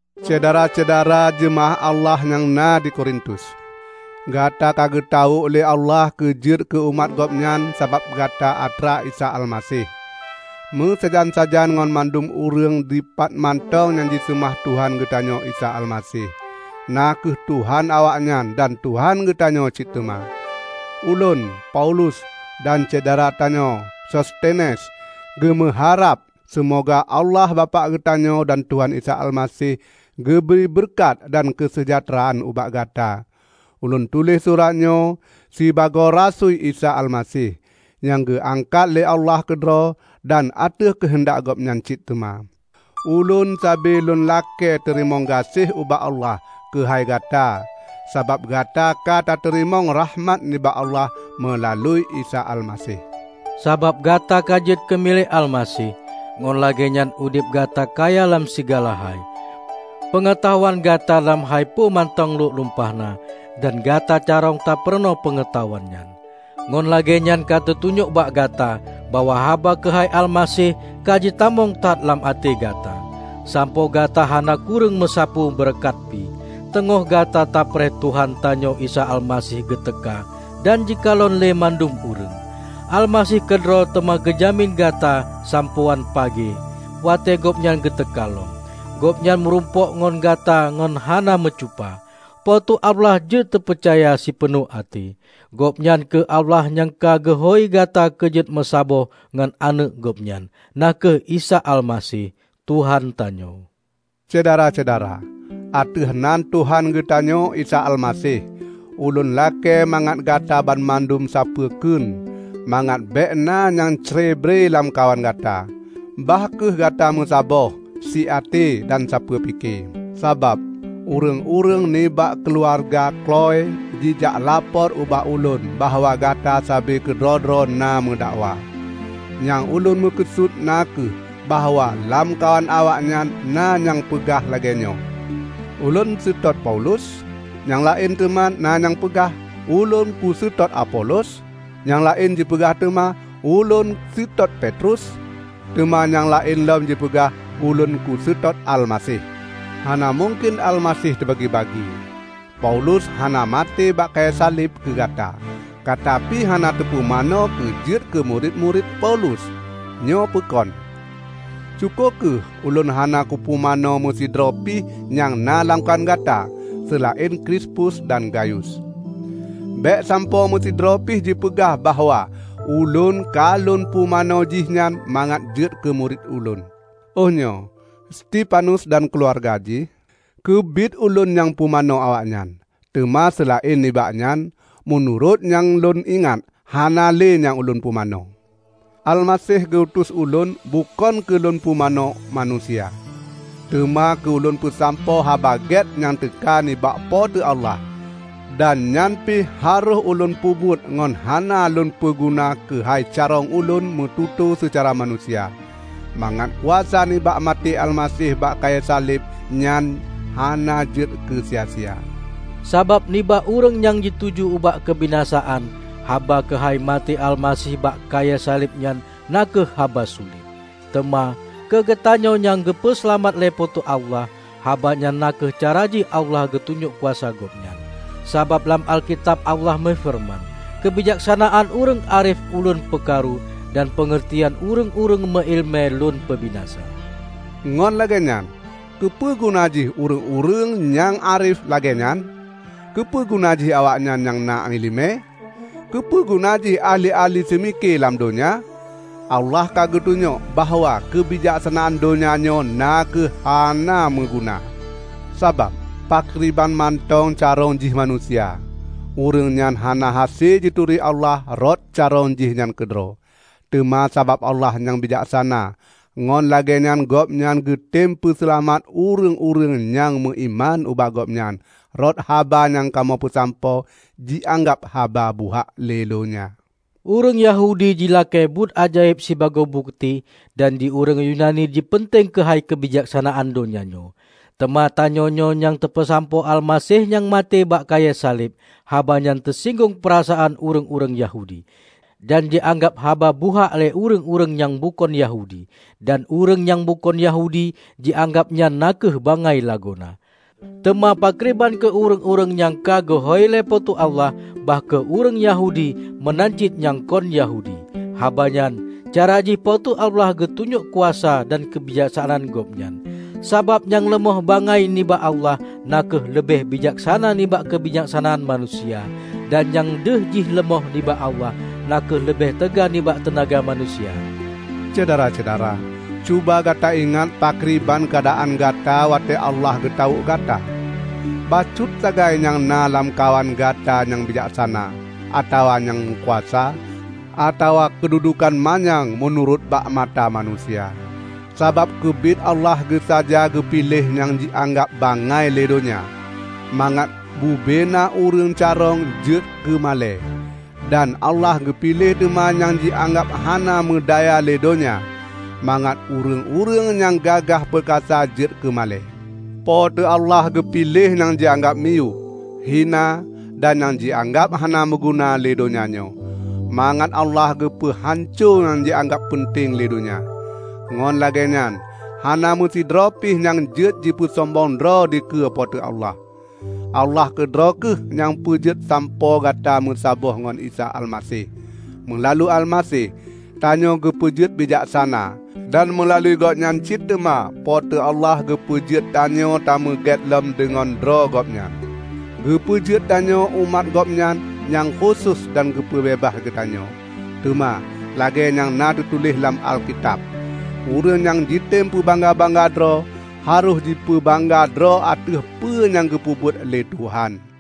Syedara-syedara jeumaáh Allah nyang na di Korintus! Gata ka geutawök lé Allah keu jeuet keu umat Gobnyan sabab Gata atra Isa Almaseh, meusajan-sajan ngon mandum ureuëng dipat mantong nyang jiseumah Tuhan geutanyoe Isa Almaseh, na kheueh Tuhan awaknyan dan Tuhan geutanyoe cit teuma. Ulôn, Paulus, dan syedara tanyoe Sostenes, geumeuharab seumoga Allah Bapak geutanyoe dan Tuhan Isa Almaseh geubri beureukat dan keuseujahteuraan ubak gata. Ulôn tuléh suratnyoe sibagoe rasui Isa Almaseh, nyang geuangkat lé Allah keudroe dan ateueh keuheundak Gobnyan cit teuma. Ulôn sabe lôn lakée teurimong gaséh ubak Allah keuhai gata, sabab gata katateurimong rakhmat nibak Allah meulalu Isa Almaseh. Sabab gata ka jeuet keumilék Almaseh, ngon lagéenyan udeb gata kaya lam sigala hai. Peungeutahuan gata lam hai peue mantong lhok lumpahna, dan gata carông tapeurunoe peungeutahuan nyan. Ngon lagéenyan ka teutunyok bak gata bahwa haba keuhai Almaseh ka jitamong that lam até gata, sampoe gata hana kureueng meusapeue beureukat pi, teungoh gata tapreh Tuhan tanyoe Isa Almaseh geuteuka dan jikalon lé mandum ureuëng. Almaseh keudroe teuma geujamin gata sampoe án pagée; watée gobnyan geuteuka lom, gobnyan meurumpok ngon gata ngon hana meucupa. Po teu Allah jeuet teupeucaya sipeunoh até. Gobnyan kheueh Allah nyang ka geuhôi gata keu jeuet meusaboh ngon Aneuëk Gobnyan, na kheueh Isa Almaseh, Tuhan tanyoe. Syedara-syedara! Ateueh nan Tuhan geutanyoe Isa Almaseh, ulôn lakée mangat gata banmandum sapeue kheun; mangat békna nyang crebre lamkawan gata. Bah kheueh gata meusaboh, siaté dan sapeue pike. Sabab, ureuëng-ureuëng nibak keuluwarga Kloë jijak lapor ubak ulôn bahwa gata sabe keudroe-droe na meudakwa. Nyang ulôn meukeusut na kheueh bahwa lamkawan awaknyan na nyang peugah lagée nyoe, "Ulôn seutôt Paulus," nyang laén na teuma nyang peugah, "Ulôn kuseutôt Apolos," nyang laén jipeugah teuma, "Ulôn seutôt Petrus," teuma nyang laén lom jipeugah, "Ulôn kuseutôt Almaseh." Hana mungken Almaseh teubagi-bagi! Paulus hana maté bak kayée saleb keugata! Gata pi hana teupumanö keu jeuet keumurit-murit Paulus, nyoe peukon? Syukoe kheueh ulôn hana kupumanö meusidroe pih nyang na lamkawan gata, seulaén Krispus dan Gayus. Bék sampoe meusidroe pih jipeugah bahwa ulôn ka lôn pumanö jih nyan mangat jeuet keumurit ulôn. ( Oh nyoe, Stefanus dan keuluwarga jih, keubiet ulôn nyang pumanö awaknyan. Teuma seulaén nibak nyan, meunurot nyang lôn ingat, hana le nyang ulôn pumanö.) Almaseh geu-utus ulôn bukon keu lôn pumanö manusia, teuma keu ulôn peusampoe Haba Gét nyang teuka nibak Po teu Allah; dan nyan pih harôh ulôn peubuet ngon hana lôn peuguna keuhai carông ulôn meututoe seucara manusia, mangat kuasa nibak maté Almaseh bak kayée saleb nyan hana jeuet keusia-sia. Sabab nibak ureuëng nyang jituju ubak keubinasaan, haba keuhai maté Almaseh bak kayée saleb nyan na kheueh haba sulet. Teuma, keugeutanyoe nyang geupeu seulamat lé Po teu Allah, haba nyan na kheueh cara jih Allah geutunyok kuasa Gobnyan. Sabab lam Alkitab Allah meufeureuman, "Keubijaksanaan ureuëng árif Ulôn peukaru, dan peungeurtian ureuëng-ureuëng meuiéleumé Lôn peubinasa." Ngon lagée nyan, keupeuguna jih ureuëng-ureuëng nyang árif lagée nyan? Keupeuguna jih awaknyan nyang na iéleumé? Keupeuguna jih ahli-ahli seumike lam donya? Allah ka geutunyok bahwa keubijaksanaan donya nyoe na kheueh hana meuguna! Sabab, pakriban mantong carông jih manusia, ureuëng nyan hana hase jituri Allah rot carông jihnyan keudroe. Teuma sabab Allah nyang bijaksana, ngon lagée nyan Gobnyan geutem peuseulamat ureuëng-ureuëng nyang meuiman ubak Gobnyan rot haba nyang kamoe peusampoe jianggab haba buhak lé donya. Ureuëng Yahudi jilakée buet ajaéb sibagoe bukeuti, dan di ureuëng Yunani jipeunteng keuhai keubijaksanaan donya nyoe. Teuma tanyoenyoe nyang tapeusampoe Almaseh nyang maté bak kayée saleb. Haba nyan teusinggong peurasaan ureuëng-ureuëng Yahudi, dan jianggab haba buhak lé ureuëng-ureuëng nyang bukon Yahudi. Dan ureuëng nyang bukon Yahudi jianggab nyan na kheueh bangai lagoena. Teuma pakriban keu ureuëng-ureuëng nyang ka geuhôi lé Po teu Allah -- bah kheueh ureuëng Yahudi meunan cit nyang kon Yahudi -- habanyan, cara jih Po teu Allah geutunyok kuasa dan keubijaksanaan Gobnyan. Sabab nyang leumoh bangai nibak Allah, na kheueh leubeh bijaksana nibak keubijaksanaan manusia; dan nyang deuh jih leumoh nibak Allah, na kheueh leubeh teuga nibak teunaga manusia. Syedara-syedara! Cuba gata ingat pakriban keuadaan gata watée Allah geutawök gata. Bacut sagai nyang na lamkawan gata nyang bijaksana, atawa nyang meukuasa, atawa keududukan manyang meunurot bakmata manusia. Sabab keubiet Allah geusaja geupiléh nyang jianggab bangai lé donya, mangat bubena ureuëng carông jeuet keumalée. Dan Allah geupiléh teuma nyang jianggab hana meudaya lé donya, mangat ureuëng-ureuëng nyang gagah peukasa jeuet keumalée. Po teu Allah geupiléh nyang jianggab miyueb, hina, dan nyang jianggab hana meuguna lé donya nyoe, mangat Allah geupeu hanco nyang jianggab peunteng lé donya. Ngon lagée nyan hana meusidroe pih nyang jeuet jipeusombong droe dikeue Po teu Allah. Allah keudroe kheueh nyang peujeuet sampoe Gata meusaboh ngon Isa Almaseh. Meulalu Almaseh, tanyoe geupeujeuet bijaksana. Dan meulalu Gobnyan cit teuma Po teu Allah geupeujeuet tanyoe tameuget lom deungon droe Gobnyan, geupeujeuet tanyoe umat Gobnyan nyang khusos dan geupeubeubaih geutanyoe. Teuma, lagée nyang na teutuléh lam Alkitab, "Ureuëng nyang jitem peubangga-bangga droe, harôh jipeubangga droe ateueh peue nyang geupeubuet lé Tuhan."